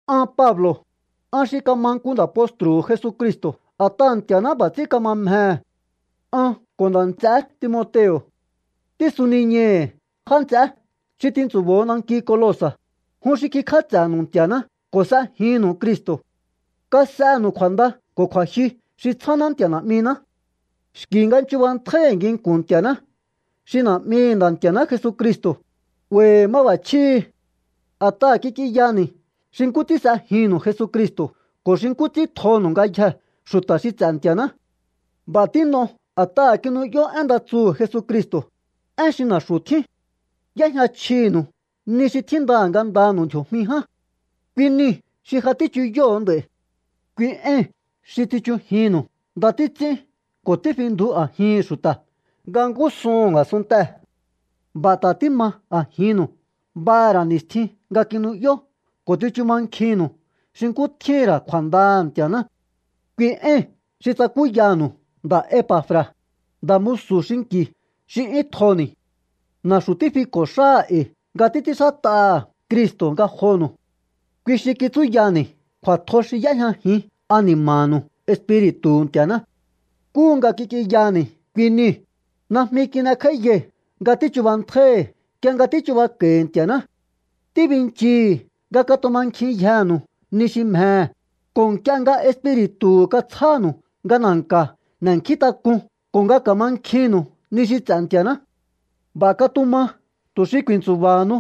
An Pablo̱, an xi kama nku nda̱ postru̱hu̱ Jesucristo̱ a̱t'aha̱ Nti̱a̱ná b'a̱ ts'ín kama mjehe̱. An ko̱ nda̱ nts'eé Timoteo̱ tísuniñai̱hi̱ já nts'eé xi tintsu̱bo̱o nanki Colosa̱, jun xi kikj'áts'e̱nu̱u Nti̱a̱ná ko̱ s'ejinnu̱u Cristo̱. Kas'enu̱u kju̱a̱nda ko̱ kju̱a̱jyu xi tsjáná Nti̱a̱ Na̱'miná. Xki̱ nga chubantjái̱hi̱ nginku̱n Nti̱a̱ná xi Na̱'mihi̱ Nda̱ Nti̱a̱ná Jesucristo̱, 'ba̱i̱hi̱ máb'a̱chjíhi̱ a̱t'aha̱ kik'inyani̱ xi nkú ts'ín s'ejinnu̱u Jesucristo̱ ko̱ xi nkú ts'ín tjonu̱u ngayjee̱ xu̱ta̱ xi ts'e̱ Nti̱a̱ná. B'a̱ tín'o a̱t'aha̱ kinu'yó én nda tsuhu̱ Jesucristo̱, én xi na̱xu̱ tjín. Y'éjña chjinu̱u ni xi tjínda ngandanu̱u ndji̱o̱jmi ján. Kui niu̱ xi ja tíchuyóho̱o nd'a̱i̱. Kui éi̱n xi tsichujinnu̱u nda títs'ín ko̱ tífindju a̱jihi̱n xu̱ta̱ nga ngúsuhu̱n a̱sunntee̱. B'a̱ ta̱ tíma a̱jinnu̱u b'aha̱ ra̱ ni̱stjin nga kinu'yó ko̱ tsichu mankjinnu̱u xi nkú tjíhi̱n ra̱ kju̱a̱ndaha̱ Nti̱a̱ná. Kui éi̱n xi tsakúyanu̱u nda̱ Epa̱fra̱, nda̱ musu̱ xinki̱ xi 'yún tjoni̱. Na̱xu̱ tífiko̱ xáha̱ e̱i̱ nga títs'ínxát'aha̱ Cristo̱ ngajonu̱u. Kui xi kitsúyani̱ kju̱a̱tjo xi y'éjñajin ani̱ma̱nu̱u Espiri̱tu̱hu̱ Nti̱a̱ná. Nkúhu nga kik'inyani̱ kui niu̱, najmi tín'ekj'áíyai̱ nga tíchubantjái̱hi̱ nk'ie nga tíchubako̱i̱ Nti̱a̱ná. Tíbinchii̱hi̱ nga katumankjinyjenu̱u ni xi mjehe̱, ko̱ nk'ie nga Espiri̱tu̱hu̱ katsjánu̱u nga na̱nka̱ n'e̱nkjíntak'un ko̱ nga ka̱mankjinnu̱u ni xi ts'e̱ Nti̱a̱ná. B'a̱ katuma tu̱ xi ku̱i̱ntsu̱ba̱hanu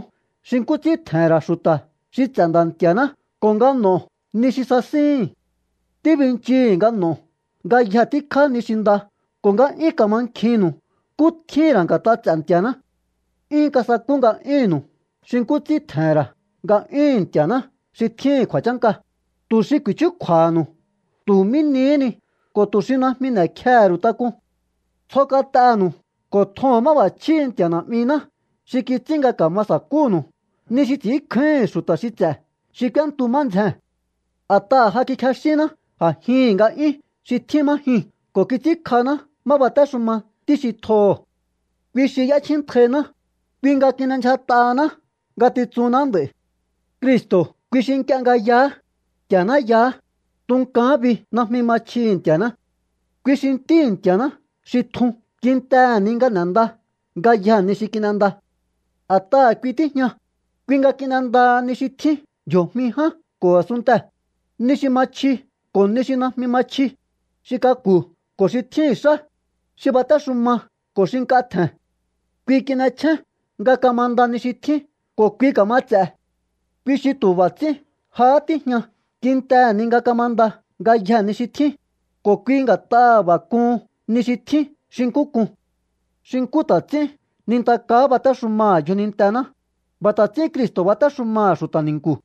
xi nkú ts'ín tje̱he̱n ra̱ xu̱ta̱ xi ts'e̱ Nda̱ Nti̱a̱ná ko̱ nga n'o̱o ni xi sasíhi̱n. Tíbinchii̱hi̱ nga n'o̱o ngayje tíkjá ni xi nda ko̱ nga 'yún ka̱mankjinnu̱u nkú tjíhi̱n ra̱ nga̱t'a ts'e̱ Nti̱a̱ná. 'Yún kasakú nga'yúnnu̱u xi nkú ts'ín tje̱he̱n ra̱ nga'yúhu̱n Nti̱a̱ná xi tjíhi̱n kju̱a̱chánka, tu̱ xi ku̱i̱chúkju̱a̱ha̱nu̱u tu̱ mí nihí ni ko̱ tu̱ xi najmi n'e̱kjehe̱ ru̱u tak'un. Tsjo kat'enu̱u ko̱ tjoho̱n máb'a̱chjíhi̱ Nti̱a̱ Na̱'miná xi kits'ín nga ka̱ma sa̱kúnu̱u ni xi ts'i̱ínkjáíhi̱n xu̱ta̱ xi ts'e̱ xi k'úéntu má ndzjee̱n. A̱t'aha̱ ja kikjexínná a̱jihi̱n nga'yún xi tjín má jyuu̱n ko̱ kits'ínkj'aná má batéxuma Ntí xi tjoho̱. Kui xi y'échjíntjainá, kui nga kin'endyjat'ahaná ngatitsunná nd'a̱i̱. Cristo̱ kui xi nk'ie nga yaá, Nti̱a̱ná yaá. Ntukaán bi najmi ma chjihi̱ Nti̱a̱ná. Kui xi Ntíhi̱ Nti̱a̱ná xi tjun kintehe̱ ni nga n'e̱nda ngayjee̱ ni xi kin'enda. A̱t'aha̱ kui tíjña, kui nga kin'endaha ni xi tjín ndji̱o̱jmi ján ko̱ a̱sunntee̱, ni xi ma chji ko̱ ni xi najmi ma chji, xi k'aku̱ ko̱ xi tjíhi̱n xá, xi batéxuma ko̱ xi nk'a tje̱n. Kui kin'echjén nga kamanda ni xi tjín ko̱ kui ka̱ma ts'e̱. Kui xi tu̱ b'a̱ ts'ín jahá tíjña kintehe̱ ni nga kamanda ngayjee̱ ni xi tjín, ko̱ kui nga̱t'aha̱ b'a̱ k'uhun ni xi tjín xi nkú k'un. Xi nkú ta̱ ts'ín nintakaá batéxumaha̱ yjonintená, b'a̱ ta̱ ts'ín Cristo̱ batéxumaha̱ xu̱ta̱ ni̱nku̱.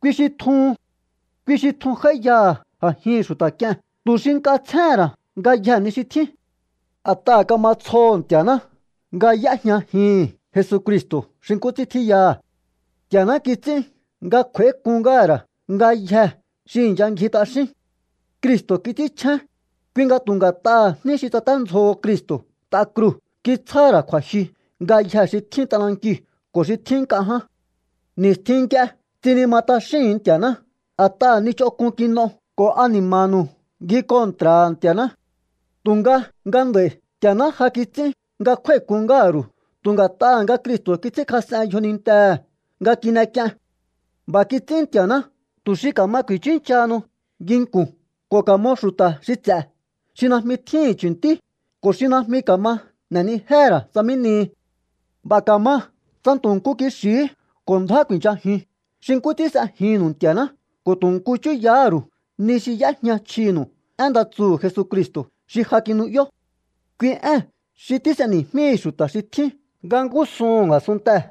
Kui xi tjuhun. Kui xi tjun j'áíyaha̱ a̱jihi̱n xu̱ta̱ k'ie̱n tu̱ xi nk'a tsjéhe̱n ra̱ ngayjee̱ ni xi tjín. A̱t'aha̱ kama tsjoho̱ Nti̱a̱ná nga y'éjñajihi̱n Jesucristo̱ xi nkú ts'ín tjíyaha̱. Nti̱a̱ná kits'ín nga kju̱a̱ík'un ngáha̱ ra̱ ngayjee̱ xi i̱ncha ngji t'axín. Cristo̱ kits'ínchjén, kui nga tu̱ nga̱t'aha̱ jní xi tsaténdzjoho Cristo̱ t'a kruu̱ kitsjáha̱ ra̱ kju̱a̱jyu ngayjee̱ xi tjín t'anankiu̱ ko̱ xi tjín nk'a ján. Ni̱stjin nk'ie tsinima t'axíhu̱un Nti̱a̱ná a̱taha̱ ni ch'onk'un kin'o ko̱ ani̱ma̱nu̱u ngji kontra̱ha̱ Nti̱a̱ná. Tu̱nga nga nd'a̱i̱ Nti̱a̱ná ja kits'ín nga kjúái̱k'un ngáha̱ ru̱u tu̱ nga̱t'aha̱ nga Cristo̱ kits'ínkjas'en yjonintehe̱ nga kin'ek'ien. B'a̱ kits'ín Nti̱a̱ná tu̱ xi ka̱ma ku̱i̱chúnchahanu nginku̱n ko̱ ka̱mo xu̱ta̱ xi ts'e̱ xi najmi tjíhi̱n chu̱ntí ko̱ xi najmi ka̱ma n'e̱nijéhe̱ ra̱ tsa mí nihi. B'a̱ ka̱ma tsa tu̱ nku kixi̱hí ko̱ ndjá ku̱i̱nchajiun xi nkú ts'ín s'ejinnu̱u Nti̱a̱ná ko̱ tu̱ nku chúyahá ru̱u ni xi y'éjña chjinu̱u én nda tsuhu̱ Jesucristo̱ xi ja kinu'yó. Kui ée̱n xi tís'eni̱jmíhi̱ xu̱ta̱ xi tjín nga ngúsuhu̱n a̱sunntee̱.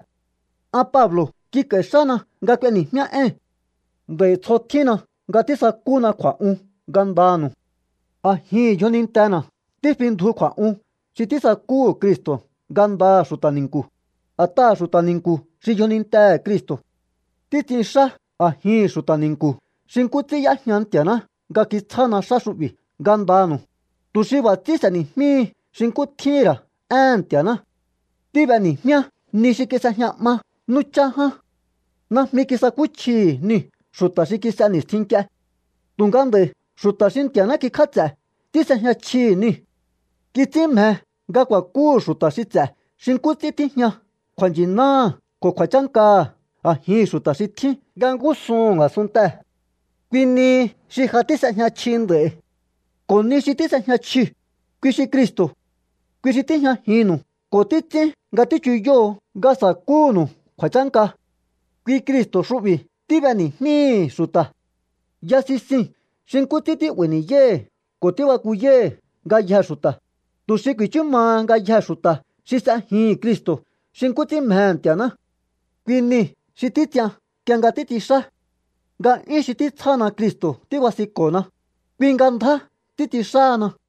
An Pablo̱ kik'a̱i̱ xána nga k'ueni̱jmíá éi̱n. Nd'a̱i̱ tsjo tjínna nga tísakúna kju̱a̱'un ngandanu̱u. A̱jihi̱n yjonintena̱ tífindju kju̱a̱'un xi tísakúhu̱ Cristo̱ ngandaha̱ xu̱ta̱ ni̱nku̱, a̱t'aha̱ xu̱ta̱ ni̱nku̱ xi yjonintehe̱ Cristo̱. Títs'inxá a̱jihi̱n xu̱ta̱ ni̱nku̱ xi nkú ts'ín y'éjña Nti̱a̱ná nga kitsjána xá xu'bi̱ ngandanu̱u, tu̱ xi b'a̱ ts'ín s'e̱ni̱jmíhi xi nkú tjíhi̱n ra̱ éhe̱n Nti̱a̱ná. Tíb'eni̱jmíá ni xi kis'ejña 'ma nú chá ján. Najmi kisakúchjihi̱ niu̱ xu̱ta̱ xi kis'e ni̱stjin nk'ie. Tu̱nga nd'a̱i̱ xu̱ta̱ xi Nti̱a̱ná kikj'áts'e̱ tís'ejña chjihi̱ niu̱. Kits'ín mje nga ku̱a̱kúhu̱ xu̱ta̱ xi ts'e̱ xi nkú ts'ín tíjña kju̱a̱nchi̱náha̱ ko̱ kju̱a̱chánkaha̱ a̱jihi̱n xu̱ta̱ xi tjín nga ngúsuhu̱n a̱sunntee̱. Kui nihi xi ja tís'ejña chji nd'a̱i̱. Ko̱ ni xi tís'ejña chjiu̱, kui xi Cristo̱. Kui xi tíjñajinnu̱u ko̱ títs'ín nga tíchuyoho̱o nga sa̱kúhu̱nu̱u kju̱a̱chánka. Kui Cristo̱ xu'bi̱ tíb'eni̱jmíi̱hi̱ xu̱ta̱. Ya sisii̱n xi nkú ts'ín tí'ba̱i̱ ni̱yái̱hi̱ ko̱ tíbakuyái̱hi̱ ngayjee̱ xu̱ta̱, tu̱ xi ku̱i̱chú maha ngayjee̱ xu̱ta̱ xi s'ejihi̱n Cristo̱ xi nkú ts'ín mjehe̱ Nti̱a̱ná. Kui nii̱ xi títs'ian nk'ie nga títs'inxá. Nga'yún xi títsjána Cristo̱ tíbasinko̱na, kui nga ndjá títs'inxáhana.